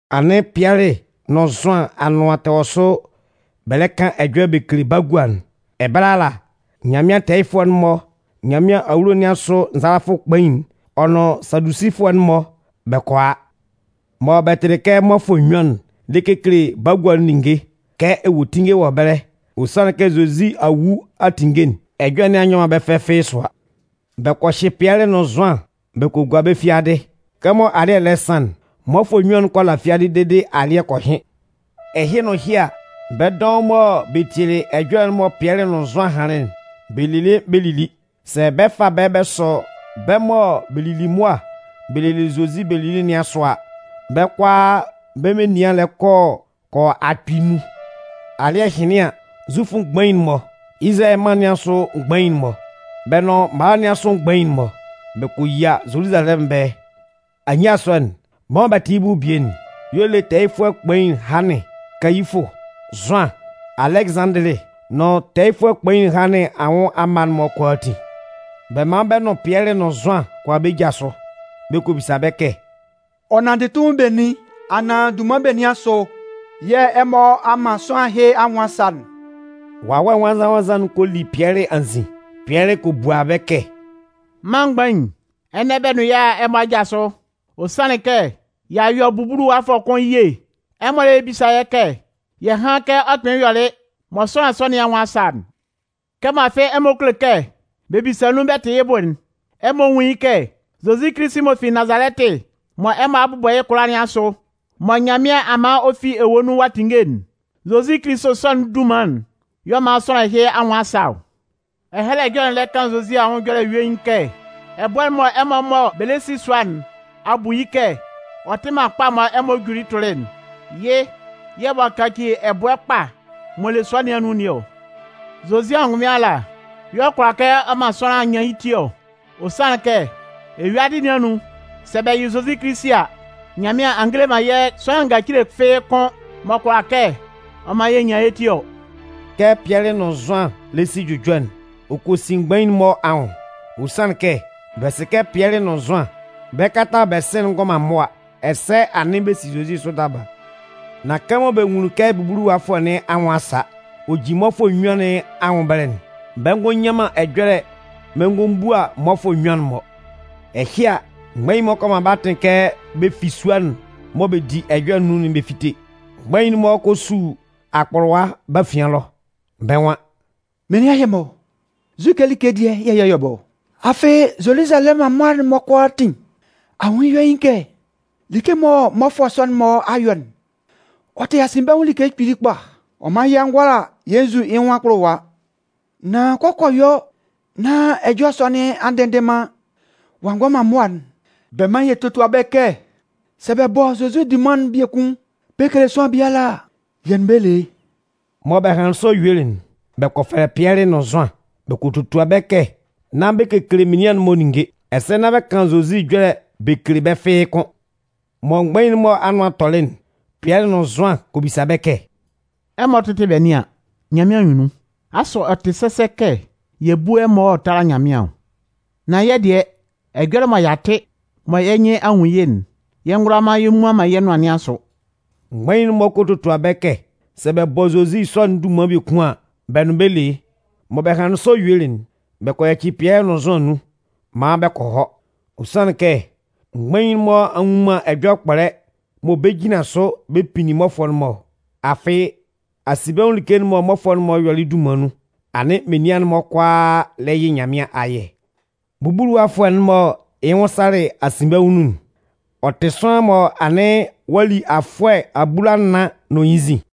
Anɩn Pɩɛlɩ nʋn Zʋan anʋan tɛ wɔ sʋ bɛ lɛ kan ɛjɔlɛ bɛ kele bagua'n, ɛbɛlɛ ala Nyanmɩan tɛɛyɩfʋɛ'n-mɔ, Nyanmɩan awulo nɩn asʋ nzalafʋ kpain'n, ɔ nʋn Sadusifʋɛ'n-mɔ bɛ kɔ a. Mɔ bɛ tɩlɩ kɛ mmɔfʋɛ nnyuan'n lɛ kekele bagua'n ninnge, kɛ ewuetinnge wɔ ɛbɛlɛ, ɔ sanlɩn kɛ Zozi a wu a tinnge'n, ɛjɔlɛ nɩn a nyɔ man bɛ́ fɛ fɩ́ɩ́ sʋa. Bɛ kɔ hyɩ Pɩɛlɩ nʋn Zʋan bɛ kɔ gua bɛ́ fiadɩ. Kɛmɔ anɩn alɩ́ɛ lɛ san'n, mmɔfʋɛ nnyuan'n kɔ la fiadɩ dede alɩ́ɛ kɔ hɩn. Ɛhɩ nʋn ɛhɩ a, bɛ́ dɔʋn mɔ bɛ tielɩ ɛjɔlɛ'n mɔ Pɩɛlɩ nʋn Zʋan hanlɩn'n, bɛ lelɩ bɛ lili. Sɛ bɛ fa bɛ́ bɛ sɔ bɛ́ mɔ bɛ lili mʋa bɛ lelɩ Zozi bɛ lili nɩn asʋ a, bɛ́ kʋalaa bɛ́ menian lɛ kɔ kɔ yɔ akpɩɩ nnun. Alɩ́ɛ hɩnlɩn an, Zufʋ mgbain'n-mɔ, Izalayɛ mân nɩn asʋ mgbain'n-mɔ, bɛ́ nʋn mala nɩn asʋ mgbain'n-mɔ, bɛ kɔ yia Zoluzalɛmʋn ɛbɛlɛ. Anyia sɔ'n, bɛ́ mɔ bɛ tɩ yɩ́ bʋ bie'n y'ɔ le tɛɛyɩfʋɛ kpain Hannɩn, Kayifʋ, Zʋan, Alɛgɩzanndɩlɩ nʋn tɛɛyɩfʋɛ kpain Hannɩn anwʋn amma'n-mɔ kʋalaatin. Bɛ man bɛ nʋn Pɩɛlɩ nʋn Zʋan kɔ a bɛ́ ja sʋ. Bɛ kɔ bisa bɛ́ kɛ: “Ɔ nanndɩ tunmin benin anaan dunman benin asʋ yɛ̂ ɛmɔ a man sʋanlan ɛhɩ anwʋn a sa'n?” Wawɛ Nwannzan-nwannzan'n kɔ li Pɩɛlɩ anzin. Pɩɛlɩ kɔ bua bɛ́ kɛ: “Mân mgbain, ɛnɛ bɛ nʋn yɛ́ a a ɛmɔ aja sʋ, ɔ sanlɩn kɛ, y'a yɔ bubuluwafʋɛ kʋn ye. Ɛmɔ lɛ bisa yɛ́ kɛ yɛ hán kɛ ɔ kpɩnlɩn yɔlɩ mɔ sʋanlan sɔ nɩn anwʋn a sa'n. Kɛmɔ afɩ ɛmɔ kulo kɛ bɛ bisa nun bɛ tɩ yɩ́ bʋ'n, ɛmɔ nwún yɩ́ kɛ, Zozi Kilisi m'ɔ fi Nazalɛtɩ mɔ ɛmɔ a bʋbɔ yɩ́ kʋlʋwa nɩn asʋ, mɔ Nyanmɩan a man ɔ fi ewue nun ɔ'a tinnge'n, Zozi Kilisi sɔ'n dunman'n y'ɔ man sʋanlan ɛhɩ anwʋn a sa ɔ. Ɛhɛlɛ Ɛjɔlɛ'n lɛ kan Zozi ɛjɔlɛ yuein kɛ: Ɛbʋɛ'n mɔ ɛmɔ mɔ bɛ lɛ si sua nɩn a bu yɩ́ kɛ ɔ tɩ man kpa mɔ ɛmɔ juli tʋlɩ'n, yɩ́ yɛ̂ ɔ'a kaci ɛbʋɛ kpa m'ɔ le sua nɩn anun nɩn ɔ! Zozi angʋnmɩn ala y'ɔ kʋala kɛ ɔ man sʋanlan nyan yɩ́ ti ɔ. Ɔ sanlɩn kɛ, eyuadɩ nɩn anun, sɛ bɛ yɩ Zozi Kilisi a, Nyanmɩan a ngele man yɛ́ sʋanlan ngacile fɩ́ɩ́ kʋn m'ɔ kʋala kɛ ɔ man yɛ nyan yɛ́ ti ɔ.” Kɛ Pɩɛlɩ nʋn Zʋan lɛ si jʋjɔ'n, ɔ kɔ sin mgbain'n-mɔ anwʋn. Ɔ sanlɩn kɛ, bɛ sɩ kɛ Pɩɛlɩ nʋn Zʋan, bɛ kalata'n mɔ bɛ si'n ngɔ man mʋa, ɛsɛ anɩn bɛ si Zozi sʋ daba. Nan kɛmɔ bɛ nwunlin kɛ bubuluwafʋɛ nɩn anwʋn a sa, ɔ jin mmɔfʋɛ nnyuan nɩn anwʋn ɛbɛlɛ'n, bɛ ngɔ nyan man ɛjɔlɛ bɛ ngɔ bua mmɔfʋɛ nnyuan'n-mɔ. Ɛhɩ a, mgbain'n-mɔ kɔ man bɛ́ atɩn kɛ bɛ fi sua'n mɔ bɛ di ɛjɔlɛ nun'n bɛ fíte. Mgbain'n-mɔ kɔ su akpʋlʋwa bɛ́ afian ɛlɔ. Bɛ́ nwan: “Menian ɛhɩ-mɔ, nzu like dɩɛ yɛ̂ yɛ yɔ́ bɛ́ ɔ? Afɩ, Zoluzalɛmʋn amma'n-mɔ kʋalaatin a nwun yɩ́ yuein kɛ like mɔ mmɔfʋɛ sɔ'n-mɔ a yɔ'n, ɔ tɩ asinbɛnwʋn like kpili kpa. Ɔ man yɛ ngʋala yɛ nzu man yɩ́ nwʋn akpʋlʋwa. Nan kɛ ɔ kɔ yɔ nán ɛjɔlɛ sɔ nɩn a ndɩnndɩn man ɔ'a ngɔ man mʋa'n, bɛ mán yɛ tótua bɛ́ kɛ, sɛ bɛ bɔ Zozi dunman'n biekun bɛ kele sʋanlan biala a, yɛ́ nʋn bɛ́ le yɩ́.” Mɔ bɛ hanlɩn sɔ yuelɩ'n, bɛ kɔ fɛlɛ Pɩɛlɩ nʋn Zʋan, bɛ kɔ totua bɛ́ kɛ nán bɛ kekele menian'n-mɔ ninnge, ɛsɛ nán bɛ kan Zozi ɛjɔlɛ bɛ kele bɛ́ fɩ́ɩ́ kʋ́n. Mɔ mgbain'n-mɔ anʋan tɔlɩ'n, Pɩɛlɩ nʋn Zʋan kɔ bisa bɛ́ kɛ: “Ɛmɔ tɩ́tɩ bɛ nɩ́an, Nyanmɩan anyunnun, asʋ ɔ tɩ sɛsɛ kɛ yɛ bú ɛmɔ ɔ tála Nyanmɩan ɔ? Nan yɛ́ dɩɛ, ɛjɔlɛ mɔ y'a tɩ, mɔ yɛ́ nyɩn a nwun yɩ́'n, yɛ ngʋala yɛ mmuan man yɛ́ nʋan nɩn asʋ.” Mgbain'n-mɔ kɔ totua bɛ́ kɛ sɛ bɛ bɔ Zozi sɔ'n dunman biekun an, bɛ nʋn bɛ́ le yɩ́. Mɔ bɛ hanlɩn sɔ yuelɩ'n, bɛ kɔ yaci Pɩɛlɩ nʋn Zʋan nun maan bɛ kɔ hɔ. Ɔ sanlɩn kɛ, mgbain'n-mɔ a nnwun man ɛjɔlɛ kpɔlɛ mɔ bɛ 'jinlan sʋ bɛ pinnin mmɔfʋɛ'n-mɔ ɔ. Afɩ, asinbɛnwʋn like'n mɔ mmɔfʋɛ'n-mɔ yɔlɩ'n dunman nun, anɩn menian'n-mɔ kʋalaa lɛ yɩ Nyanmɩan ayɛ. Bubuluwafʋɛ'n mɔ yɩ́ nwʋn salɩ asinbɛnwʋn nun'n, ɔ tɩ sʋanlan mɔ anɩn ɔ'a li afʋɛ abulanan nʋn yɩ́ nzin.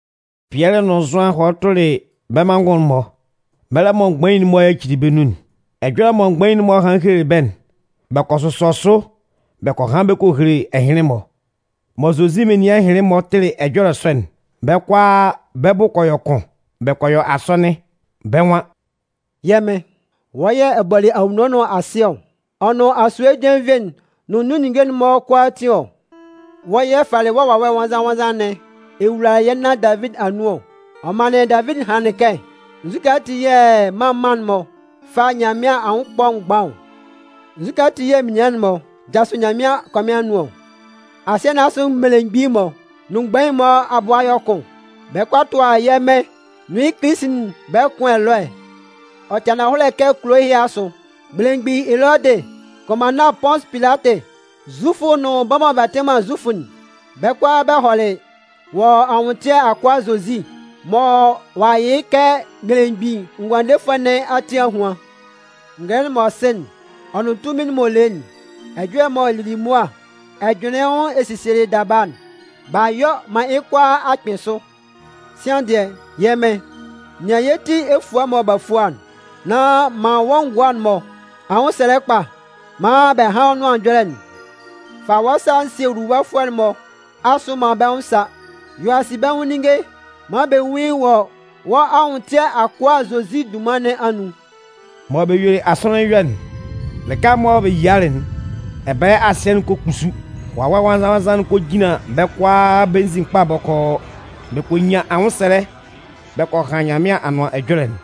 Pɩɛlɩ nʋn Zʋan hɔlɩ tʋlɩ bɛ́ manngʋn'n-mɔ, mɛlɛ mɔ mgbain'n-mɔ yacili bɛ́ nun'n. Ɛjɔlɛ mɔ mgbain'n-mɔ hanlɩn helelɩ bɛ́'n, bɛ kɔ sʋsɔ sʋ bɛ kɔ han bɛ kɔ hele ɛhɩnlɩn-mɔ. Mɔ Zozi menian ɛhɩnlɩn-mɔ tɩlɩ ɛjɔlɛ sɔ'n, bɛ́ kʋalaa bɛ́ bʋ kɔ yɔ kʋn. Bɛ kɔ yɔ asɔnɩn, bɛ́ nwan: “Yɛ́ Mɩn, wɔ́ yɛ̂ ɛ bɔlɩ anwunno nʋn asɩ ɔ, ɔ nʋn asue jenvie'n nʋn nun ninnge'n-mɔ kʋalaatin ɔ. Wɔ́ yɛ̂ ɛ falɩ Wawɛ Nwannzan-nwannzan nɩn ɛ wulalɩ yɛ́ nan Davidi anun ɔ. Ɔ manlɩn Davidi hanlɩn kɛ: Nzukɛ ati yɛ̂ mân mân'n-mɔ fa Nyanmɩan anwʋn ɛkpɔ mgban ɔ? Nzukɛ ati yɛ̂ menian'n-mɔ jasʋ Nyanmɩan akɔmɩn anun ɔ? Asɩɛ nɩn asʋ mmelemgbin'n-mɔ nʋn mgbain'n-mɔ abʋ a yɔ kʋn, bɛ lɛ kɔ a tʋa yɛ́ Mɩn nʋn yɩ́ Kilisi'n bɛ kʋn ɛlɔɛ. “Ɔ tɩ ananhɔlɛ kɛ kulo ɛhɩ asʋ, belemgbin Elɔdɩ, kʋnmanna Pʋnsʋ Pilatɩ, Zufʋ nʋn bɛ́ mɔ bɛ tɩ man Zufʋ'n, bɛ́ kʋalaa bɛ hɔlɩ wɔ́ anwʋntɩɛ akʋa Zozi m'ɔ a yɩ yɩ́ kɛ Belemgbin Ngʋandefʋɛ nɩn ati ahuan. Ngɛlɛ'n mɔ ɛ sɩ ɔ nʋn tunmin'n mɔ ɛ le yɩ́'n, ɛjɔlɛ mɔ ɛ lili mʋa ɛ jʋnlɩnlɩn yɩ́ nwʋn ɛ sielɩ daba'n, b'a yɔ maan yɩ́ kʋalaa a kpɩn sʋ. Sian dɩɛ, yɛ́ Mɩn, nɩan yɛ́ ti efua mɔ b'a fua'n, nán man wɔ́ ngʋa'n-mɔ anwʋnsɛlɛ kpa maan bɛ hán wɔ́ nʋan ɛjɔlɛ'n. Fa wɔ́ sa sie nwuluwafʋɛ'n-mɔ asʋ maan bɛ́ nwʋn sá, yɔ asinbɛnwʋn ninnge maan bɛ nwún yɩ́ wɔ wɔ́ anwʋntɩɛ akʋa Zozi dunman nɩn anun.” Mɔ bɛ yuelɩ asɔnɩn'n yɔ'n, lɩka mɔ bɛ yialɩ'n, ɛbɛlɛ asɩɛ'n kɔ kpusu. Wawɛ Nwannzan-nwannzan'n kɔ jinlan bɛ́ kʋalaa bɛ́ nzin kpa bɔkɔɔ. Bɛ kɔ nyan anwʋnsɛlɛ bɛ kɔ han Nyanmɩan Anʋan Ɛjɔlɛ'n.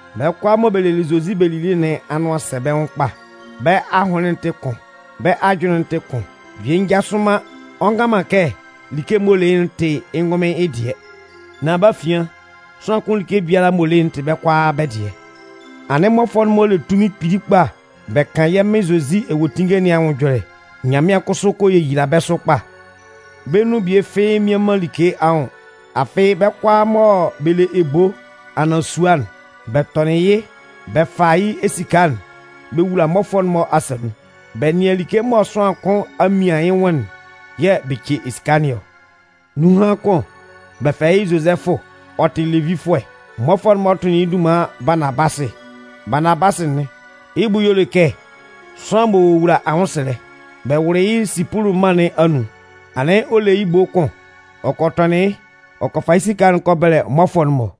Bɛ́ kʋalaa mɔ bɛ lelɩ Zozi bɛ lili nɩn anʋan sɛ bɛ́ nwʋn kpa, bɛ́ ahʋnlɩn'n tɩ kʋn, bɛ́ ajʋnlɩn'n tɩ kʋn. Bie njasʋ man ɔ ngan man kɛ like m'ɔ le yɩ́'n tɩ yɩ́ ngʋnmɩn yɩ́ dɩɛ. Nan bɛ́ afian, sʋanlan kʋn like m'ɔ le yɩ́'n tɩ bɛ́ kʋalaa bɛ́ dɩɛ. Anɩn mmɔfʋɛ'n-mɔ le tunmin kpili kpa bɛ kan yɛ́ Mɩn Zozi ewuetinnge nɩn anwʋn ɛjɔlɛ. Nyanmɩan kʋsʋ kɔ yeyila bɛ́ sʋ kpa. Bɛ́ nun bie fɩ́ɩ́ mmian man like anwʋn. Afɩ, bɛ́ kʋalaa mɔ bɛ le ebo anaan sua'n, bɛ tɔnɩn yɩ́ bɛ fa yɩ́ esika'n bɛ wula mmɔfʋɛ'n-mɔ asa nun. Bɛ nɩan like mɔ sʋanlan kʋn a mian yɩ́ nwʋn'n yɛ̂ bɛ ce esika nɩn ɔ. Nunhan kʋn, bɛ fɛlɛ yɩ́ Zozɛfʋ, ɔ tɩ Levifʋɛ. Mmɔfʋɛ'n-mɔ tʋnlɩn yɩ́ dunman Baanabasɩ. Baanabasɩ'n yɩ́ bʋ y'ɔ le kɛ “Sʋanlan m'ɔ wowula anwʋnsɛlɛ”. Bɛ wʋlɩ yɩ́ Sipʋlʋ mân nun. Anɩn ɔ le yɩ́ ebo kʋn. Ɔ kɔ tɔnɩn yɩ́, ɔ kɔ fa yɩ́ esika'n kɔ bɛlɛ mmɔfʋɛ'n-mɔ.